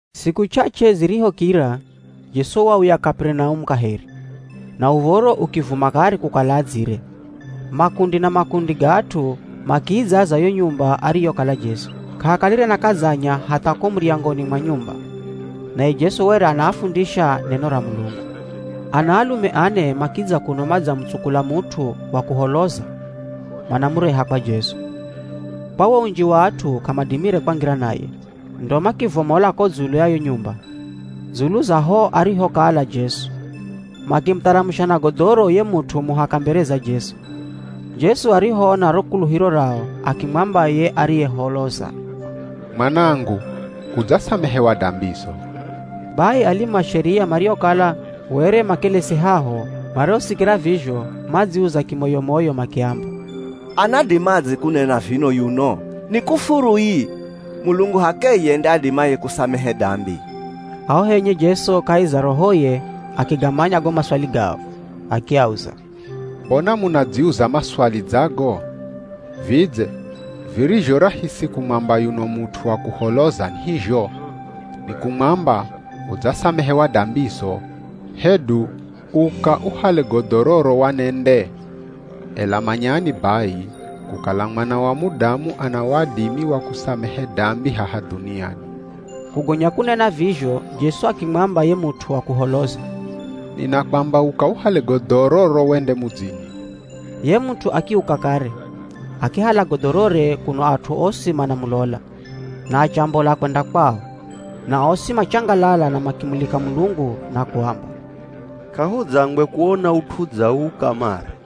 Siku ch'ach'e zirihokira, Jesu wauya Kaperinaumu kaheri, na uv̱oro ukivuma kare kukala adzire. Makundi na makundi ga at'u, makiidzaza yo nyumba ariyokala Jesu. K'ahakalire na kadzanya hatha ko muryangoni mwa nyumba; naye Jesu were anaafundisha neno ra Mulungu. Ana alume ane makidza kuno madzamutsukula mut'u wa kuholoza manamureha kwa Jesu. Kwa wo unji wa at'u k'amadimire kwangira naye. Ndo makivomola ko dzulu ya yo nyumba, dzulu za ho arihokala Jesu, makimutharamusha na godhoro ye mut'u muhaka mbere za Jesu. Jesu arihoona ro kuluhiro rao, akimwamba ye ariyeholoza, “Mwanangu, udzasamehewa dambizo!” Bai alimu a Sheria mariokala were makelesi haho marihosikira vizho madziuza kimoyo-moyo makiamba, “Anadimadze kunena vino yuno? Ni kufuru ii, Mulungu h'akeye nde adimaye kusamehe dambi!” Haho henye Jesu kahi za rohoye, akigamanya go maswali gao, akiauza, “Mbona munadziuza maswali dza go? Vidze virizho rahisi kumwamba yuno mut'u wa kuholoza ni hizho? Ni kumwamba, ‘Udzasamehewa dambizo,’ hedu ‘Uka, uhale godhororo wanende?’ Ela manyani bai, kukala Mwana wa Mudamu ana wadimi wa kusamehe dambi haha dhuniani.” Kugonya kunena vizho Jesu akimwamba ye mut'u wa kuholoza, “Ninakwamba uka uhale godhororo wende mudzini.” Ye mut'u akiuka kare, akihala godhorore kuno at'u osi manamulola, na achombola kwenda kwao. Na osi machangalala na makimulika Mulungu na kuamba, “K'ahudzangwe kuona ut'u dza uu kamare.”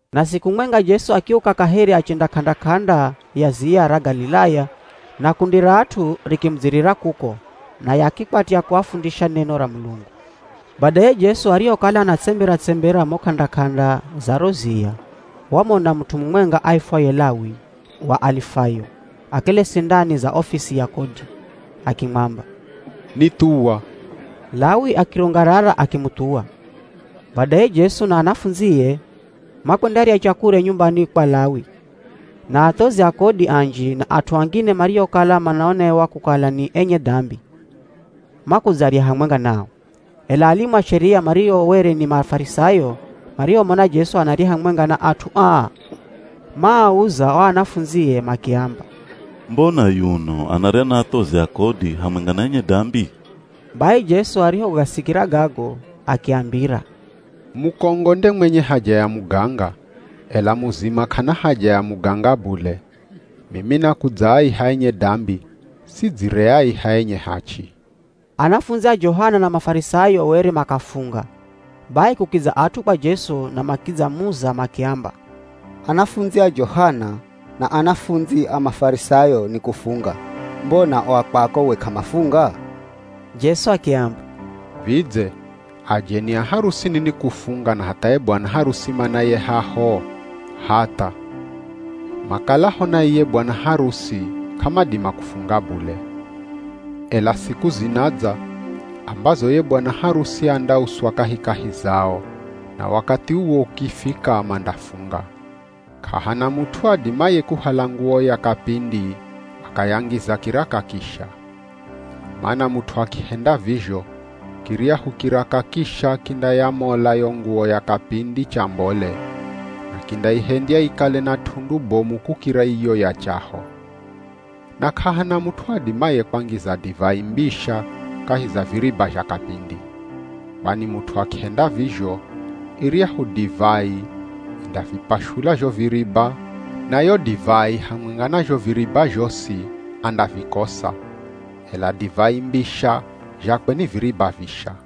Na siku mwenga Jesu akiuka kaheri achenda k'anda-k'anda ya ziya ra Galilaya na kundi ra at'u rikimudzirira kuko naye akikwatya kuafundisha neno ra Mulungu. Badaye Jesu arihokala anatsembera-tsembera mo k'anda-k'anda za ro ziya, wamona mut'u mumwenga aifwaye Lawi wa Alifayo akelesi ndani za ofisi ya kodi. Akimwamba, “Nithuwa.” Lawi akirungarara akimuthuwa. Badaye Jesu na anafundzie, makwendarya chakurya nyumbani kwa Lawi. Na athozi a kodi anji na at'u angine mariokala manaonewa kukala ni enye dambi, makudzarya hamwenga nao. Ela alimu a Sheria mario were ni Mafarisayo marihomona Jesu anarya hamwenga na at'u aa, maauza o anafundzie makiamba, “Mbona yuno anarya na athozi a kodi hamwenga na enye dambi?” Bai Jesu arihogasikira gago akiambira, “Mukongo nde mwenye haja ya muganga, ela muzima k'ana haja ya muganga bule. Mimi nakudzaaiha enye dambi, sidzireaiha enye hachi!” Anafundzi a Johana na Mafarisayo were makafunga, bai kukidza at'u kwa Jesu na makidzamuza makiamba, “Anafundzi a Johana na anafundzi a Mafarisayo ni kufunga, mbona o a kwako we k'amafunga?” Jesu akiamba, “Vidze ajeni a harusini ni kufunga na hatha ye bwana harusi manaye haho? Hatha! Makalaho na iye bwana harusi k'amadima kufunga bule. Ela siku zinadza, ambazo ye bwana harusi andauswa kahikahi zao, na wakathi uwo ukifika mandafunga. K'ahana mut'u adimaye kuhala nguwo ya kapindi akayangiza kiraka kisha. Mana mut'u akihenda vizho, kiryahu kiraka kisha kindayamola yo nguwo ya kapindi chambole, na kindaihendya ikale na t'undu bomu kukira iyo ya chaho. Na k'ahana mut'u adimaye kwangiza divai mbisha kahi za viriba zha kapindi. Kwani mut'u akihenda vizho, iryahu divai indavipashula zho viriba na yo divai hamwenga na zho viriba zhosi andavikosa. Ela divai mbisha zhakwe ni viriba visha.”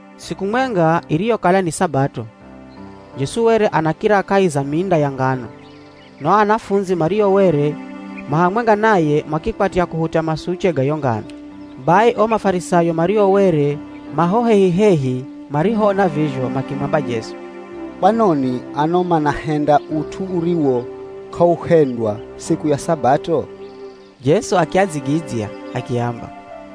Siku mwenga iriyokala ni Sabato, Jesu were anakira kahi za minda ya ngano, na o anafundzi mario were ma hamwenga naye makikwatya kuhuta masuche ga yo ngano. Bai o Mafarisayo mario were ma ho hehi-hehi marihoona vizho makimwamba Jesu, “Kwanoni ano manahenda ut'u uriwo k'auhendwa siku ya Sabato?” Jesu akiadzigidzya akiamba,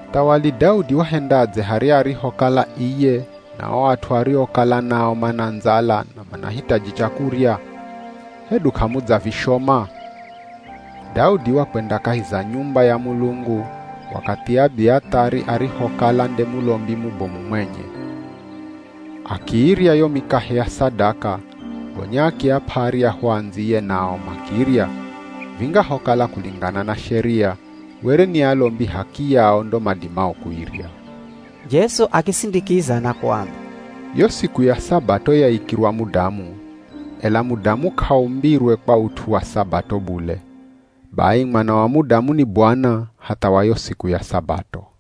“Muthawali Daudi wahendadze harya arihokala iye na o at'u ariokala nao mana ndzala na manahitaji chakurya? Hedu k'amudzavishoma? Daudi wakwenda kahi za nyumba ya Mulungu wakathi Abiathari arihokala nde mulombi mubomu mwenye, akiirya yo mikahe ya sadaka, gonya akiap'a aryahu andziye nao, makirya, vingahokala kulingana na sheria, were ni alombi h'akiyao ndo madimao kuirya.” Jesu akisindikiza na kuamba, “Yo siku ya Sabato yaikirwa mudamu, ela mudamu k'aumbirwe kwa ut'u wa Sabato bule. Bai Mwana wa Mudamu ni Bwana, hatha wa yo siku ya Sabato.”